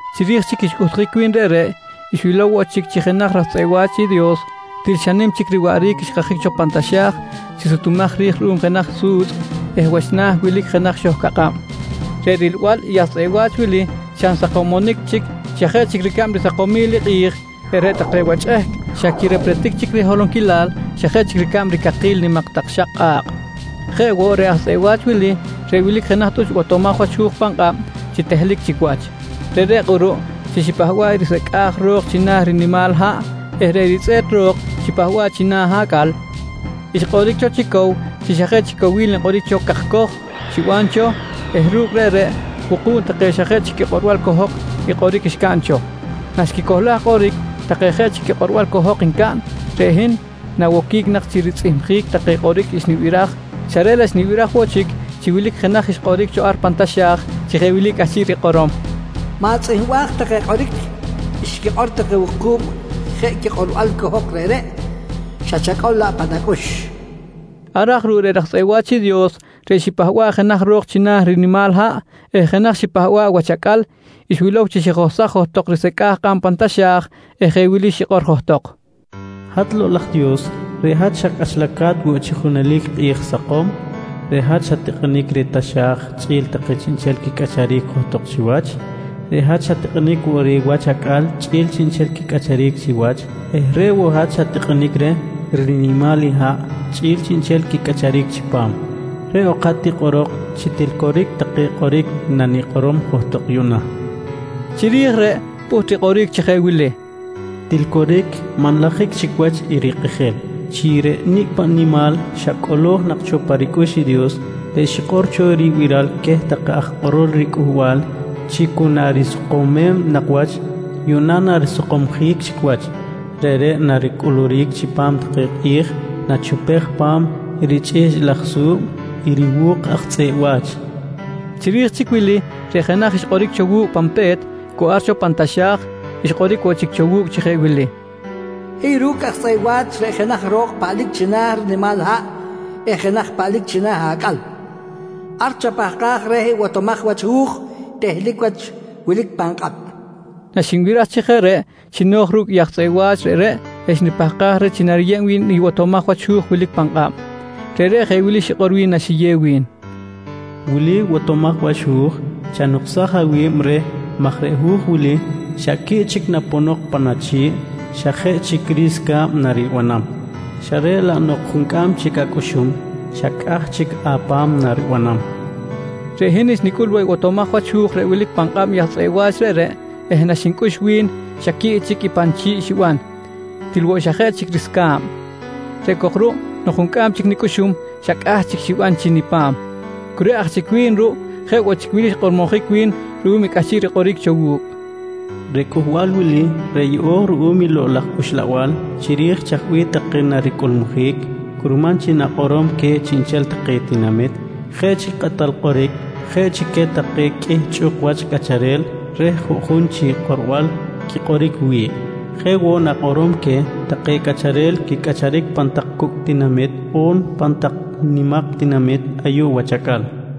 Chiri̱j chic xcꞌuhtjic wi̱n reꞌreꞌ, xwilow woꞌ chic chi jenaj chic raj tzꞌeꞌ wa̱ch i Dios til xa nim chic riwaꞌric xkajic cho pan taxa̱j chi sutumaj ri̱j ruꞌum jenaj su̱tzꞌ eh wach na̱ wilic jenaj xohcakꞌab. Reꞌ rilbal i aj tzꞌeꞌ wa̱ch wili xa nsakomonic chic xa jeꞌ chic ricab risakomil i kꞌi̱j eh reꞌ take wach chꞌehc xa quirepretic chic riholonquilal xa jeꞌ chic ricab ricakil nimak tak xak kꞌa̱kꞌ. Jeꞌ woꞌ, reꞌ aj tzꞌeꞌ wa̱ch wili reꞌ wilic jenaj tꞌuch botomaj wach hu̱j pan kꞌab chi tehlic chic wach. Reꞌreꞌ kꞌuruꞌ chi xipahba̱ꞌ i risecꞌa̱j ro̱k china̱ rinimal haꞌ eh reꞌ ritzꞌe̱t ro̱k xipahba̱ꞌ china̱ acꞌal xkꞌoric cho chi cow chi xa jeꞌ chic cowil nkꞌoric cho cakcoj xiban cho eh ru̱cꞌ reꞌreꞌ wuku̱b take xa jeꞌ chic quikꞌorbal cohok i kꞌoric xcaꞌn cho. Naxquicohlaj kꞌoric take jeꞌ quikꞌorbal cohok ncaꞌn, reꞌ hin nawoquic nak chi ritzꞌihmjic take kꞌoric xnibiraj, xa reꞌ laꞌ xnibiraj woꞌ chic chi wilic jenaj xkꞌoric cho ar pan taxa̱j chi jeꞌ wili cꞌahchiꞌ rikꞌorom: «Ma̱tzꞌihmbaj take kꞌoric xquikꞌor take wuku̱b jeꞌ quikꞌorbal cohok reꞌreꞌ, xa chacꞌol laꞌ pan acꞌux, nqui wi̱n. Ar aj ruꞌ reꞌ raj tzꞌeꞌ wa̱ch i Dios reꞌ xipahba̱ꞌ jenaj ro̱k china̱ rinimal haꞌ eh jenaj xipahba̱ꞌ wach acꞌal xwilow chi xijohsaj johtok risecꞌa̱j kꞌab pan taxa̱j eh jeꞌ wili xikꞌor johtok: «Hat Lokꞌ laj Dios, reꞌ hat xa cꞌachalca̱t woꞌ chi junelic kꞌi̱j sakom. Reꞌ hat xat-tikꞌinic reh taxa̱j chꞌi̱l take chiꞌnchel quicꞌacharic johtok chiwach. Reꞌ hat xat-tikꞌinic woꞌ reh wach acꞌal chꞌi̱l chiꞌnchel quicꞌacharic chiwach eh reꞌ woꞌ hat xat-tikꞌinic reh rinimal haꞌ chꞌi̱l chiꞌnchel i quicꞌacharic chipam. Reꞌ ok hat tikꞌorok chi til coric take kꞌoric nanikꞌorom johtok yuꞌna, nqui xikꞌor. Chiri̱j reꞌ, pꞌuht rikꞌoric chi je wili: «Til coric, manlajic chic wach i rikꞌijil chi reꞌ nicꞌ paꞌ nimal xa cꞌolo̱j nak cho pa ricꞌux i Dios reꞌ xikꞌor cho ribiral queh take aj kꞌorol riCꞌuhbal chi cu narisakomem nak wach, yuꞌna narisakomjic chic wach. Reꞌreꞌ naricꞌuluric chipam take kꞌi̱j nachupej pa̱m richꞌihchꞌ laj su̱b i riwu̱k aj tzꞌeꞌ wa̱ch, nqui xikꞌor. Chiri̱j chic wili, reꞌ jenaj reꞌ xkꞌoric woꞌ cho wu̱cꞌ pan pe̱t cu ar cho pan taxa̱j, xkꞌoric woꞌ chic cho wu̱cꞌ chi jeꞌ wili: «Hiy ru̱cꞌ aj tzꞌeꞌ wa̱ch reꞌ jenaj ro̱k paꞌlic china̱ rinimal haꞌ eh jenaj paꞌlic china̱ acꞌal. Ar chapahkaj reh i botomaj wach hu̱j tehlic wach wilic pan kꞌab, nqui wi̱n. Naxinbiraj chi jeꞌ reꞌ, xino̱j ru̱cꞌ i aj tzꞌeꞌ wa̱ch reꞌreꞌ eh xnipahkaj reh chi nariyeb wi̱n i botomaj wach hu̱j wilic pan kꞌab. Reꞌreꞌ jeꞌ wili xikꞌor wi̱n naxiyew wi̱n: «Wili i botomaj wach hu̱j. Chanuksaj awi̱b reh maj reꞌ hu̱j wili xa quiꞌ chic naponok pan achi̱ꞌ xa jeꞌ chic risca̱b naribanam, xa reꞌ laꞌ nok juncꞌam chic acꞌuxum xa cꞌah chic apa̱m naribanam, nqui wi̱n. Reꞌ hin xnicꞌul woꞌ i botomaj wach hu̱j reꞌ wilic nak pan kꞌab i aj tzꞌeꞌ wa̱ch reꞌreꞌ eh naxnicꞌux woꞌ wi̱n xa quiꞌ chic i pa nichi̱ꞌ xiban til woꞌ xa jeꞌ chic risca̱b. Reꞌ cok ruꞌ nok juncꞌam chic nicꞌuxum, xa cꞌah chic xiban chi nipa̱m. Cu reꞌ aj chic wi̱n ruꞌ, jeꞌ woꞌ chic wili xkꞌormojic wi̱n ruꞌum i cꞌahchiꞌ rikꞌoric cho wu̱cꞌ: «Reꞌ cꞌuhbal wili reꞌ yeꞌo̱j ruꞌum i Lokꞌ laj Uxlabal chiri̱j chaj bih take naricꞌulmujic, curman chi na̱kꞌorom queh chiꞌnchel take tinamit, jeꞌ chi kꞌatal kꞌoric jeꞌ chi queh take qꞌuih chꞌuk wach cꞌacharel reh juꞌjun chi kꞌorbal quikꞌoric wi̱ꞌ. Jeꞌ woꞌ na̱kꞌorom queh take cꞌacharel quicꞌacharic pan tak cucꞌ tinamit on pan tak nimak tinamit ayuꞌ wach acꞌal, nqui wi̱n.